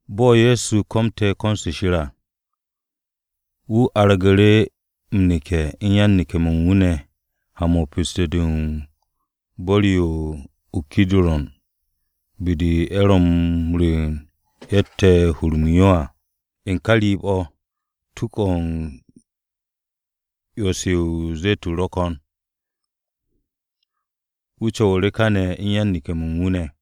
Bo̱ Ye̱so komte̱ ko̱n-se Shir à, wu̱ argu̱ru̱ m-neke̱ u̱n yan-neke̱-mo̱ u̱n wu̱ ne̱ ha-mo̱ u̱n pesto-de u̱n bu̱r-yo o-Kidurun be-de ye̱ ro̱ m-rwu̱u̱n ye̱tte̱ m-hur m-yo à. U̱n o̱ ka riib-o̱ tuk-o̱ u̱n 'yo-se o-ze̱tun ro̱ ko̱n. Wu̱ co̱wu̱ru̱ kane̱ u̱n yan-neke̱-mo̱ u̱n wu̱ ne̱.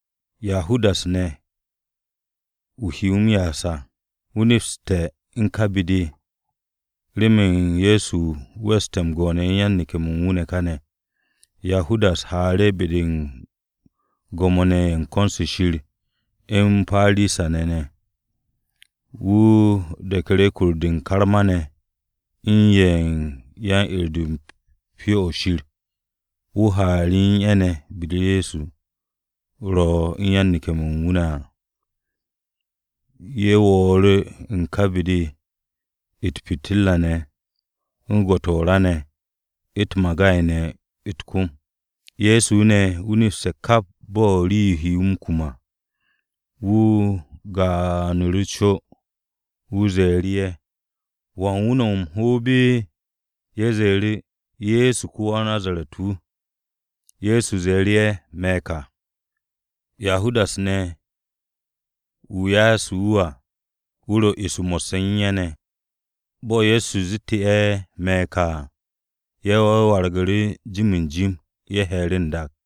Yahudas ne̱, wu̱ he wu̱ m-ya'as à, wu̱ nepste̱ ka be-de, remen Ye̱so weste̱ m-go'one̱ u̱n yan-neke̱-mo̱ u̱n wu̱ ne̱ kane̱. Yahudas haaru̱ be-de u̱n Gwo̱mo-ne̱ ye̱ u̱n ko̱n-se Shir u̱n Parisa-ne̱ ne̱. Wu̱ de̱knu̱ru̱ kur-de u̱n karma-ne̱ u̱n ye̱ ken yan-'er-de u̱n Pyo-o̱ Shir ye̱ ne̱. Wu̱ haanu̱ru̱ u̱n ye̱ ne̱, be-de Ye̱so ro u̱n yan-neke̱-mo̱ u̱n wu̱ ne̱ à. Ye̱ wo̱o̱nu̱ru̱ u̱n ka be-de u̱t-pitirra ne̱, u̱n gwo̱-to̱ o-ra ne̱, u̱t-magay ne̱ u̱t-kom. Ye̱so ne̱, wu̱ nepste̱ kap bo̱ u̱n rii-yo he wu̱ m-kum à. Wu̱ gaanu̱ru̱ co, wu̱ ze̱e̱ru̱ ye̱, “¿Wan wu̱ ne̱ no̱ o-hoob?” Ye̱ ze̱e̱ru̱, “Ye̱so ko-ya-o-Nazaret-wu̱.” Ye̱so ze̱e̱ru̱ ye̱, “Me̱ ka.” Yahudas ne̱, wu̱ ya'asu̱ wu̱ à, wu̱ ro eso mo̱sse̱ u̱n ye̱ ne̱. Bo̱ Ye̱so zette̱ ye̱, “Me̱ ka” à, ye̱ wargu̱ru̱ jim jim, ye̱ he̱e̱ru̱ n-dak.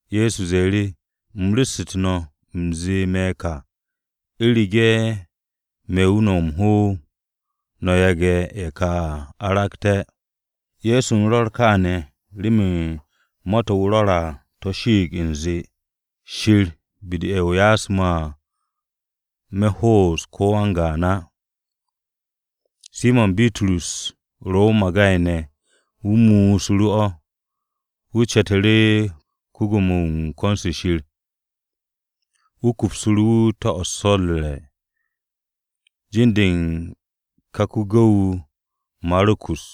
Ye̱so ze̱e̱ru̱, “U̱m ru̱ssu̱tu̱ no̱, u̱m zee, ‘Me̱ ka.’ U̱rege̱ me̱ wu̱ no̱ o-hoob, no̱ yage̱ ye̱ ka aragte̱.” Ye̱so u̱n rwo̱r kááne̱ remen ma-to̱ wu̱ rwo̱r à to̱ shiit u̱nze, “Shir be-de u̱n ye̱ o ya'asu̱ me̱ à, me̱ ho'os ko̱ wan-gaan á.” Simo̱n Bitrus ro o-magay ne̱. Wu̱ mu'usu̱ru̱ o̱, wu̱ ce̱tu̱ru̱ ko-gu̱w-wu̱ u̱n ko-Gwo̱mo-wu̱ u̱n ko̱n-se Shir. Wu̱ kupsu̱ru̱ wu̱ to̱-o̱ u̱n so̱ u̱r-re̱. Jin-de u̱n ka ko-gu̱w-wu̱ Maru̱kus.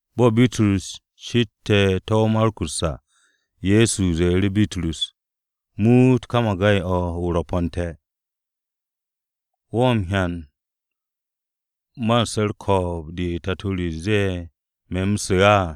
Bo̱ Bitrus ce̱te̱ to̱-o Maru̱kus à, Ye̱so ze̱e̱ru̱ Bitrus, “Muut ka magay-o̱ o-rwo̱po̱nte̱. ¿Wo̱ m-hyan man su̱ u̱r-ko̱o̱b de Tato re ze̱e̱ me̱ u̱m su̱ á?”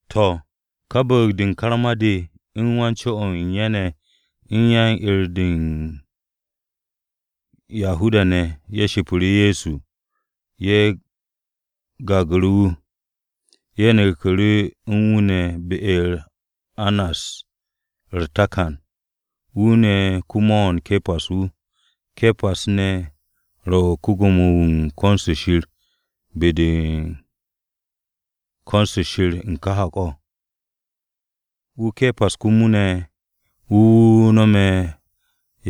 To̱, ka bu̱u̱g-de u̱n karma-ne̱ de u̱n wan-co o̱ u̱n ye̱ ne̱ u̱n yan-'er-de u̱n Yahuda-ne̱, ye̱ shipiru̱ Ye̱so. Ye̱ gagu̱ru̱ wu̱. Ye̱ neku̱ru̱ u̱n wu̱ ne̱ be-u̱r Annas u̱r-takan. Wu̱ ne̱ ko-mo̱o̱n Ke̱pas wu̱. Ke̱pas ne̱ wu̱ ro ko-Gwo̱mo-wu̱ u̱n ko̱n-se Shir be-de u̱n ko̱n-se Shir u̱n ka hak-o̱. Wu̱ Ke̱pas komo ne̱, wu̱ wu̱ nome̱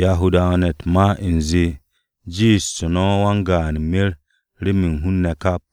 Yahuda-ne̱ u̱t-ma u̱nze, “Jiishtu̱ no̱ wan-gaan mer remen hun-ne̱ kap.”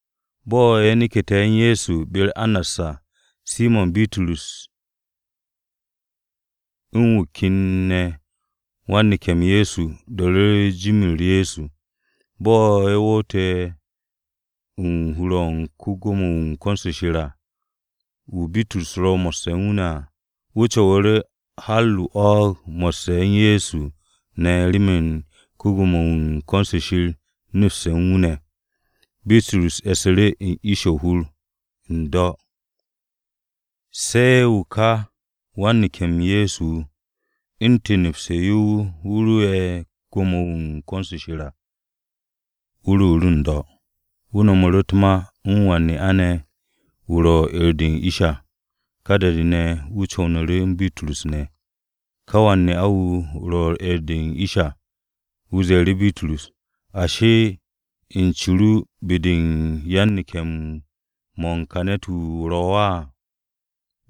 Bo̱ ye̱ neke̱te̱ u̱n Ye̱so ne̱ be-u̱r Annas à, Simo̱n Bitrus u̱n wu̱ ken ne̱ wan-neke̱-m Ye̱so do̱ru̱ru̱ jim-u̱r Ye̱so. Bo̱ ye̱ woote̱ u̱n hur-o̱ u̱n ko-Gwo̱mo-wu̱ u̱n ko̱n-se Shir à, wu̱ Bitrus ro mo̱sse̱ u̱n wu̱ ne̱ à, wu̱ co̱wu̱ru̱ har o-'wo̱o̱g mo̱sse̱ u̱n Ye̱so ne̱ remen ko-Gwo̱mo-wu̱ u̱n ko̱n-se Shir nepste̱ u̱n wu̱ ne̱. Bitrus e̱su̱ru̱ u̱n ish o-hur n-do̱. Se̱ wu̱ ka wan-neke̱-m Ye̱so wu̱, u̱ntu̱n nepse̱ yo wu̱ ro'e̱ be-de u̱n ko-Gwo̱mo-wu̱ u̱n ko̱n-se Shir à, wu̱ ruuru̱ n-do̱, wu̱ no̱mu̱ru̱ u̱t-ma u̱n wan-ne'a ne̱ wu̱ ro u̱n 'er-de u̱n ish à. Ka da-de ne̱, wu̱ co̱wo̱nu̱ru̱ u̱n Bitrus ne̱. Ká wan-ne'a-wu̱ ro u̱n 'er-de u̱n ish à, wu̱ ze̱e̱ru̱ Bitrus, “Ashi, ¿u̱n ce ru, be-de u̱n yan-neke̱-mo̱ u̱n ka ne̱t-wu̱ o ro̱ á?”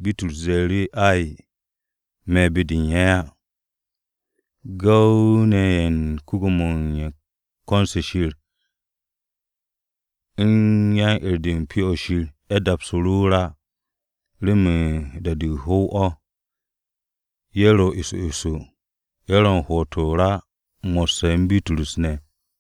Bitrus ze̱e̱ru̱ wu̱, “Ay, me̱ be-de u̱n ye̱ á.” Gu̱w-ne̱ ye̱ u̱n ko-Gwo̱mo-wu̱ u̱n ko̱n-se Shir u̱n yan-'er-de u̱n Pyo-o̱ Shir ne̱, ye̱ dapsu̱ru̱ o-ra remen da-de o-hu̱w o̱. Ye̱ ro eso eso, ye̱ ro m-hwo̱'o̱t o-ra mo̱sse̱ u̱n Bitrus ne̱.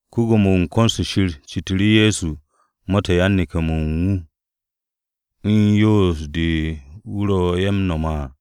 Ko-Gwo̱mo-wu̱ u̱n ko̱n-se Shir citu̱ru̱ Ye̱so ma-to̱ u̱n yan-neke̱-mo̱ u̱n wu̱ u̱n yo yoos-de u̱n wu̱ ro ye̱ ne̱ m-nome̱ à.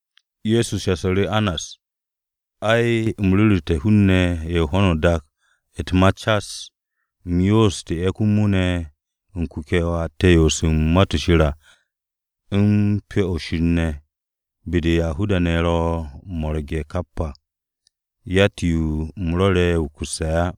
Ye̱so shasu̱ru̱ Annas, “Ai, u̱m ru̱ru̱te̱ hun-ne̱ ye̱ u̱n ho̱no o-dak u̱t-ma cas. U̱m yooste̱ komo ne̱ u̱n kuke̱-to̱ atte̱ m-yoos u̱n Ma-to̱ Shir à u̱n Pyo-o̱ Shir ne̱, be-de Yahuda-ne̱ ro̱ m-mo̱rge̱ kap à. Yatt-yo u̱m rwo̱re̱ wukusse̱ á.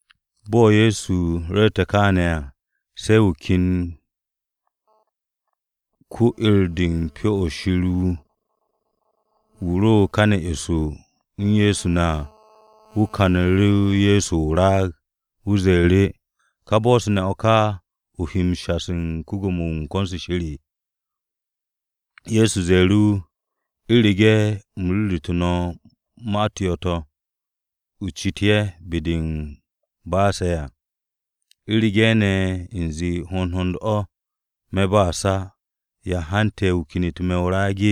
Bo̱ Ye̱so ru̱rte̱ kááne̱ à, se̱ wu̱ ken ko-wa-'er-de u̱n Pyo-o̱ Shir wu̱, wu̱ ro káne̱ eso u̱n Ye̱so ne̱ à, wu̱ kanu̱ru̱ Ye̱so o-raag. Wu̱ ze̱e̱ru̱, “¿Ka bo̱-se ne̱ o̱ ka o he m-shasu̱ u̱n ko-Gwo̱mo-wu̱ u̱n ko̱n-se Shir?” Ye̱so ze̱e̱ru̱ wu̱, “U̱rege̱ u̱m ru̱ru̱tu̱ no̱ ma-u̱t yo̱-to̱, o cit ye̱ be-de m-ba'ase̱ à. U̱rege̱ ne̱ u̱nze hond hond o̱, me̱ ba'as á. ¿Ya hante̱ u̱n ya o kenet me̱ o-raag?”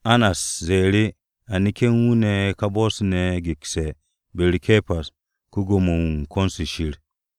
Annas ze̱e̱ru̱, “A neke̱ u̱n wu̱ ne̱ ka bo̱-se ne̱ gekse̱ be-u̱r Ke̱pas ko-Gwo̱mo-wu̱ u̱n ko̱n-se Shir.”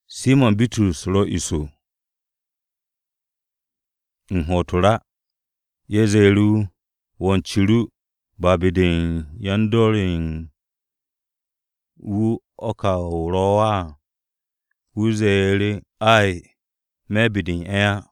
Simo̱n Bitrus ro eso, u̱n hwo̱'o̱t o-ra. Ye̱ ze̱e̱ru̱ wu̱, “¿Wo̱ u̱n ce ru, ba be-de u̱n yan-dor ye̱ u̱n wu̱ o̱ ka o ro̱ á?” Wu̱ ze̱e̱ru̱, “Ay, me̱ be-de u̱n ye̱ á.”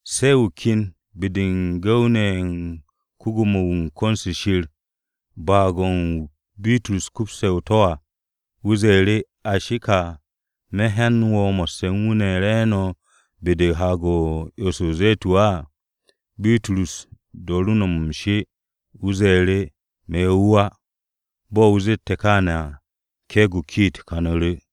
Se̱ wu̱ ken be-de u̱n gu̱w-ne̱ ye̱ u̱n ko-Gwo̱mo-wu̱ u̱n ko̱n-se Shir, baag-o̱ u̱n wu̱ Bitrus kupse̱ o-to̱ à. Wu̱ ze̱e̱ru̱, “Ashi ka, ¿me̱ hyan wo̱ mo̱sse̱ u̱n wu̱ ne̱ re̱e̱no̱ be-de u̱n Haag-o̱ u̱n 'yo-se o-Ze̱tun á?” Bitrus dooru̱ no̱m m-she, wu̱ ze̱e̱ru̱, “Me̱ wu̱ á.” Bo̱ wu̱ zette̱ kááne̱ à, ke̱e̱g-o̱ o-kiit kanu̱ru̱.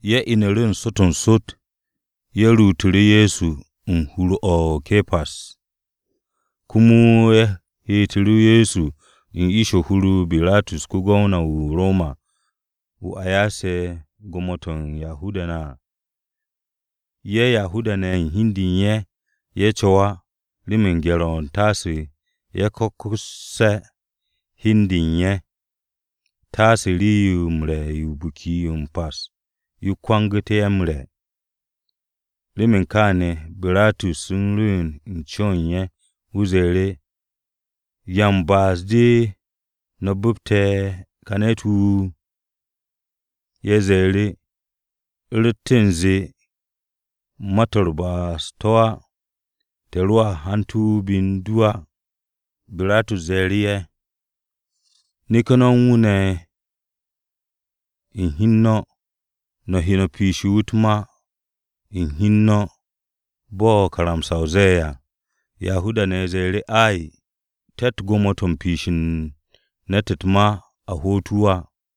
Ye̱ inu̱ru̱ n-sot n-sot, ye̱ ruutu̱ru̱ Ye̱so u̱n hur-o Ke̱pas komo ye̱ heetu̱ru̱ Ye̱so u̱n ish u̱n hur-o Biratus ko-Gwamna-wu̱ o-Roma wu̱ a ya'ase̱ gwo̱mo-to̱ u̱n Yahuda-ne̱ à. Ye̱ Yahuda-ne̱ u̱n hi u̱n de u̱n ye̱, ye̱ co̱w á, remen ye̱ o-gye̱r taase ye̱ ko̱kku̱sse̱ hi u̱n de u̱n ye̱, taase rii-yo m-re̱ yo u̱n Biki-o̱ m-Pas, yo kwangu̱ ye̱ m-re̱. Remen kááne̱, Biratus u̱n rwu̱u̱n u̱n co-o̱ u̱n ye̱, wu̱ ze̱e̱ru̱, “¿Ya u̱n ba'as-de no̱ bu̱pte̱ ka ne̱t-wu̱?” Ye̱ ze̱e̱ru̱, “U̱ rotte̱ u̱nze ma-to̱ u̱r-ba'as to̱ á, te̱ roa hante̱ wu̱ be u̱n du á.” Biratus ze̱e̱ru̱ ye̱, “Neke̱ no̱ u̱n wu̱ ne̱ u̱n hi u̱n no̱, no̱ he no̱ piishe̱ wu̱ u̱t-ma u̱n hi u̱n no̱ bo̱ karamsa-o ze̱e̱ à.” Yahuda-ne̱ ze̱e̱ru̱ wu̱, “Ay, te̱tt gwo̱mo-to̱ u̱n piishe̱ u̱n ne̱t u̱t-ma a hoot wu̱ á.”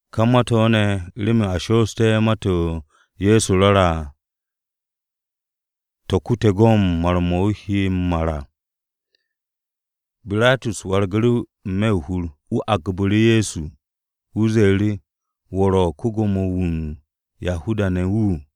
Ka ma-to̱ ne̱ remen a shoosté̱ o̱ Ma-to̱ Ye̱so rwo̱re̱ à, to̱ kute̱ go̱n mar-mo̱ wu̱ he m-mar à. Biratus wargu̱ru̱ n-me̱ o-hur. Wu̱ agbu̱ru̱ Ye̱so, wu̱ ze̱e̱ru̱, “¿Wo̱ ro̱ ko-Gwo̱mo-wu̱ u̱n Yahuda-ne̱?”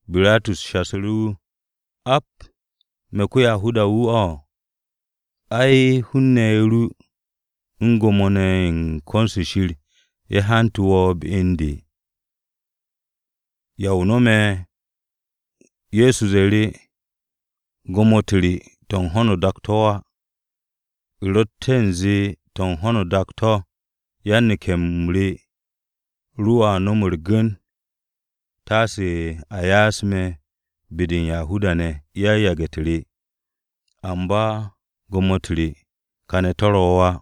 Biratus shasu̱ru̱ wu̱, “¿Ap, me̱ ko-Yahuda-wu̱ o̱? Ai, hun-ne̱ ru u̱n Gwo̱mo-ne̱ ye̱ u̱n ko̱n-se Shir ne̱ ye̱ hante̱ wo̱ be u̱n de. ¿Ya o no̱m?” Ye̱so ze̱e̱ru̱, “Gwo̱mo-u̱t re to̱ u̱n ho̱n dak-o̱ to̱ á. U̱ rotte̱ u̱nze to̱ u̱n ho̱no o-dak to̱, yan-neke̱-m re roa nom u̱r-gu̱n taase a ya'as me̱ be-de u̱n Yahuda-ne̱, yan-yage̱-u̱t re. Amba gwo̱mo-u̱t re kàne̱ o̱ to̱ ro̱ á.”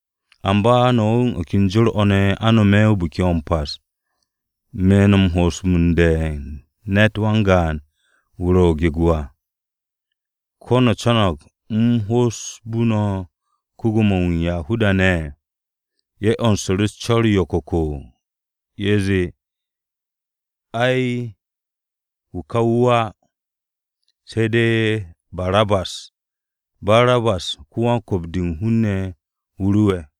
Amba no̱ u̱n o̱ ken jor-o̱ ne̱, a nome̱ Biki-o̱ m-Pas, me̱ no̱ m-ho'osbe̱ u̱n ne̱t wan-gaan wu̱ ro̱ gego à. ¿Ko̱ no̱ co̱no̱g u̱m ho'osbu̱ no̱ ko-Gwo̱mo-wu̱ u̱n Yahuda-ne̱?” Ye̱ 'yonsu̱ru̱ u̱s-co̱r yo̱ko̱ko̱, ye̱ zee, “Ay, wu̱ ka wu̱ á! Se̱ de̱ Barabas!” (Barabas ne̱ wan-kwu̱p-de u̱n hun-ne̱ wu̱ rowe̱.)